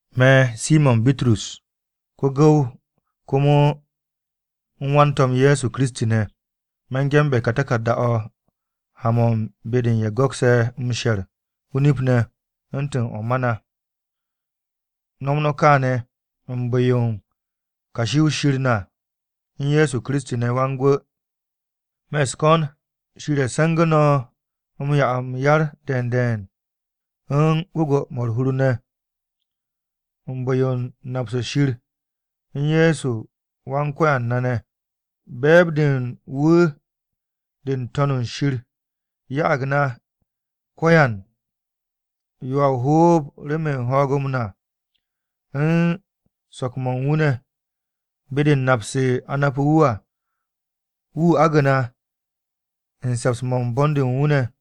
Me̱, Simo̱n Bitrus, ko-gu̱w komo u̱n wan-To̱m Ye̱soKiristi ne̱. Me̱ ge̱nbe̱ ka taku̱rda-o̱ ha-mo̱ u̱n be-de u̱n ye̱ go̱kse̱ m-she̱r o-nip ne̱ u̱ntu̱n mo̱ ma na. No̱ u̱n nom kaane̱ u̱n bu̱-yo kashi-o̱ Shir na u̱n Ye̱so Kiristi ne̱ Wan-Gwu̱. Me̱ u̱s-ko̱n Shir 'ye se̱ngu̱ no̱ m-'ya m-yar de̱e̱n de̱e̱n, u̱n gwu̱gwu̱-mo̱ u̱r-hur u̱n bu̱-yo nap-se Shir u̱n Ye̱so Wan-Ko̱yan na ne̱. Be̱e̱b-de u̱n wu̱ de n-To̱n shir ya'ag na ko̱yan yo a o-hoob remen ho̱o̱g-m na u̱n so̱k-mo̱ u̱n wu̱ ne̱ be-de u̱n nap-se a napu̱ wu̱ à. Wu̱ agu̱ na u̱n se̱ps-mo̱ u̱n bon-de u̱n wu̱ ne̱.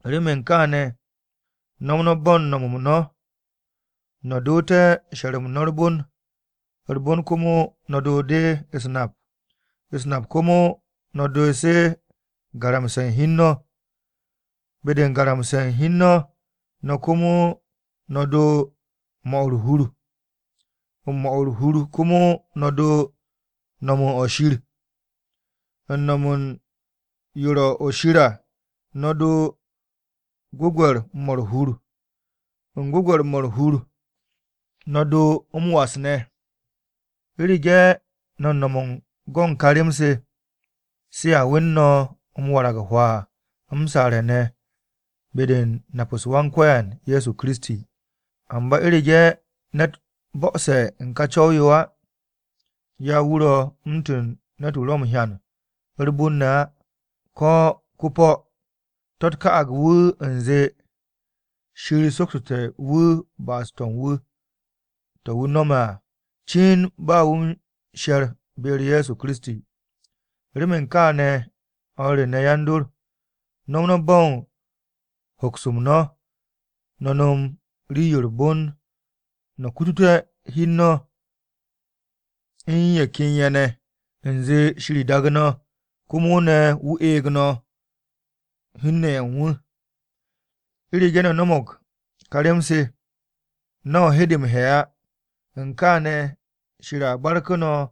Remen kááne̱, no̱m no̱ bo̱ u̱n no̱m-m no̱, no̱ doote̱ she̱r-m no̱ u̱r-bon, u̱r-bon komo no̱ doo de u̱s-nap, u̱s-nap komo no̱ doo se garamse̱ u̱n hi u̱n no̱, be-de u̱n garamse̱ hi u̱n no̱ komo no̱ doo u̱n 'mo̱ u̱r-hur, u̱n 'mo̱ u̱r-hur komo no̱ doo no̱m u̱n o-shir. U̱n no̱m u̱n yo ro̱ o-shir à, no̱ doo gwu̱gwe̱r-mo̱ u̱r-hur, u̱n gwu̱gwe̱r-mo̱ u̱r-hur no̱ doo m-was ne̱. U̱rege̱ no̱ m-no̱m u̱n go̱ u̱n kà rem-se, se a wen no̱ m-warag hwaa m-saare̱ ne̱ be-de u̱n nap-u̱s Wan-Ko̱yan Ye̱so Kiristi. Amba u̱rege̱ ne̱t bo̱'o̱se̱ u̱n ka co̱w-yo á, ya wu̱ ro̱ u̱ntu̱n ne̱t-wu̱ ro̱ m-hyan u̱r-bon ne̱ á ko̱ ko-po̱. To̱-u̱t ka'ag wu̱ u̱nze, Shir soksote̱ wu̱ ba'as-to̱ u̱n wu̱, to̱ wu̱ nome̱ à cin ba wu̱ u̱n she̱r be-u̱r Ye̱so Kiristi. Remen kaane̱ o̱r re ne̱ yan-dor, no̱m no̱ bo̱ u̱n hoks-m no̱, no̱ no̱m rii-yo u̱r-bon no̱ kututé̱ hi u̱n no̱ u̱n ye̱ ken ye̱ ne̱ u̱nze Shir daagu̱ no̱ komo ne̱ wu̱ eeg no̱ hun-ne̱ ye̱ u̱n wu̱. U̱rege̱ no̱ no̱mo̱g ka rem-se, no̱ hede m-he̱ á. U̱n kaane̱, Shir a barku̱ no̱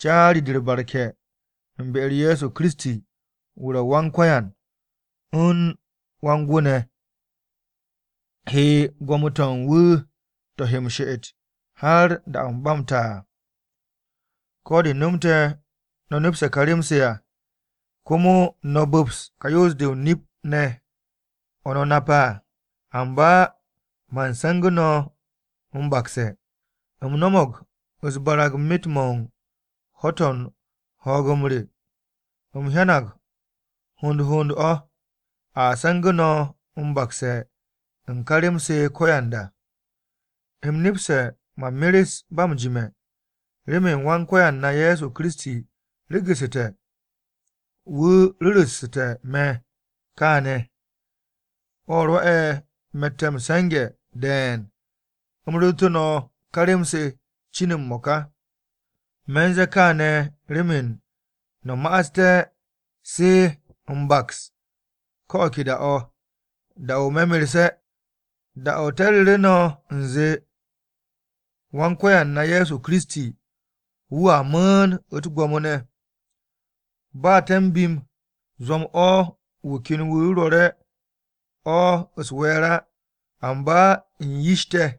caari-de u̱r-barke̱ u̱n be-u̱r Ye̱so Kiristi wu̱ ro̱ Wan-Ko̱yan u̱n Wan-Gwu̱ ne̱ he gwo̱mo-to̱ u̱n wu̱ to̱ he m-she'et har da-o̱ ba m-ta à. Ko̱ de nomte̱ no̱ nepse̱ ka rem-se à, komo no̱ bu̱ps ka yoos-de o-nip ne̱ o̱ no̱ nape̱ à, amba man se̱ngu̱ no̱ m-bakse̱. U̱m no̱mo̱g u̱s-barag myet-mo̱ u̱n ho̱-to̱ u̱n ho̱o̱g-m re, u̱m hyanag hond hond o̱, a se̱ngu̱ no̱ m-bakse̱ u̱n ká rem-se ko̱yanda. U̱m nepse̱ man meres ba m-jime̱. Remen Wan-Ko̱yan na Ye̱so Kiristi regu̱su̱te̱, wu̱ ru̱ssu̱te̱ me̱ kaane̱. O̱ rwo̱'e̱ me̱tte̱ m-se̱nge̱ de̱e̱n u̱m ru̱ru̱tu̱ no̱ ká rem-se cin m-mo̱ka. Me̱ u̱n ze̱e̱ kááne̱ remen no̱ ma'asté̱ se m-baks ko̱ o̱ ke da-o̱, da-o̱ me̱ merse̱. Da-o̱ te̱ ru̱ru̱ no̱ u̱nze, Wan-Ko̱yan na Ye̱so Kiristi, wu̱a mu̱u̱n u̱t-gwo̱mo ne̱, ba te̱ m-bim zwo̱m-o̱ wu̱ ken wu̱ rwo̱re̱ o̱ u̱s-we̱e̱r á. Amba u̱n yish te̱,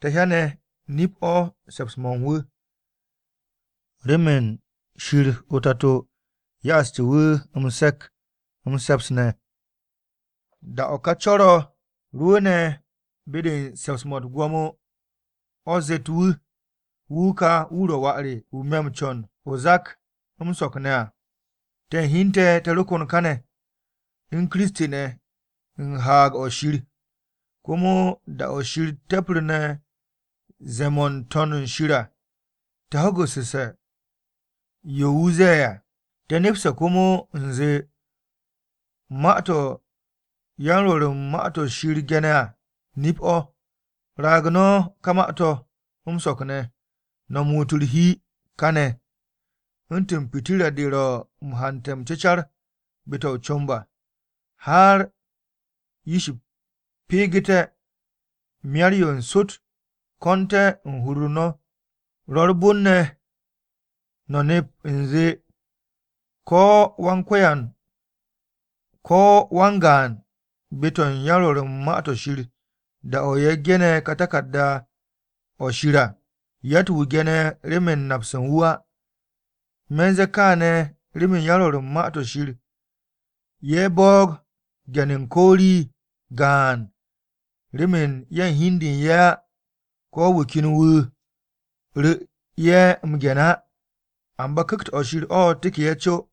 te̱ hyane̱ nip-o̱ u̱n se̱ps-mo̱ u̱n wu̱. Remen Shir o-Tato ya'astu̱ wu̱ m-se̱k m-se̱ps ne̱, da-o̱ ká co̱r-o̱ rwu̱u̱ne̱ be-de u̱n se̱ps-mo̱ u̱t-gwo̱mo o̱ zet wu̱, “Wu̱ ka wu̱ ro̱ Wà re, wu̱ me̱ m-co̱n o-zak m-so̱k ne̱ à.” Te̱ u̱n hi u̱n te̱, te̱ ro kon káne̱ u̱n Kiristi ne̱ u̱n haag-o̱ Shir, komo da-o̱ Shir te̱pru̱ne̱ ze̱e̱-mo̱ n-To̱n shir à, te̱ ho̱gu̱sse̱ yo wu̱ ze̱e̱ à. Te̱ nepse̱ komo u̱nze, ma-to̱ yan-Rwo̱r u̱n Ma-to̱ Shir ge̱ne̱ à nip-o̱. Raag no̱ ka Ma-to̱ m-so̱k ne̱ no̱ muut u̱r-hi káne̱, u̱ntu̱n pitirra-de ro̱ m-hante̱ m-cecar be-to̱ o-comb à, har ish peegete̱, Myar-yo n-Sot ko̱nte̱ u̱n hur-u̱r no̱. Ro̱ u̱r-bon ne̱ no̱ nep u̱nze, ko̱ wan-gaan be-to̱ u̱n yan-Rwo̱r u̱n Ma-to̱ Shir da-o̱ ye̱ ge̱ne̱ taku̱rda-o̱ Shir à, yatt-wu̱ ge̱ne̱ remen napse̱ u̱n wu̱ á. Me̱ u̱n ze̱e̱ kááne̱ remen yan-Rwo̱r u̱n Ma-to̱ Shir ye̱ boog ge̱n u̱n ko̱ rii gaan remen ye̱ u̱n hi u̱n de u̱n ye̱ á, ko̱ wu̱ ken wu̱ ru̱ ye̱ m-ge̱n á amba Ku̱kt-o̱ Shir o̱ teke̱ ye̱ co.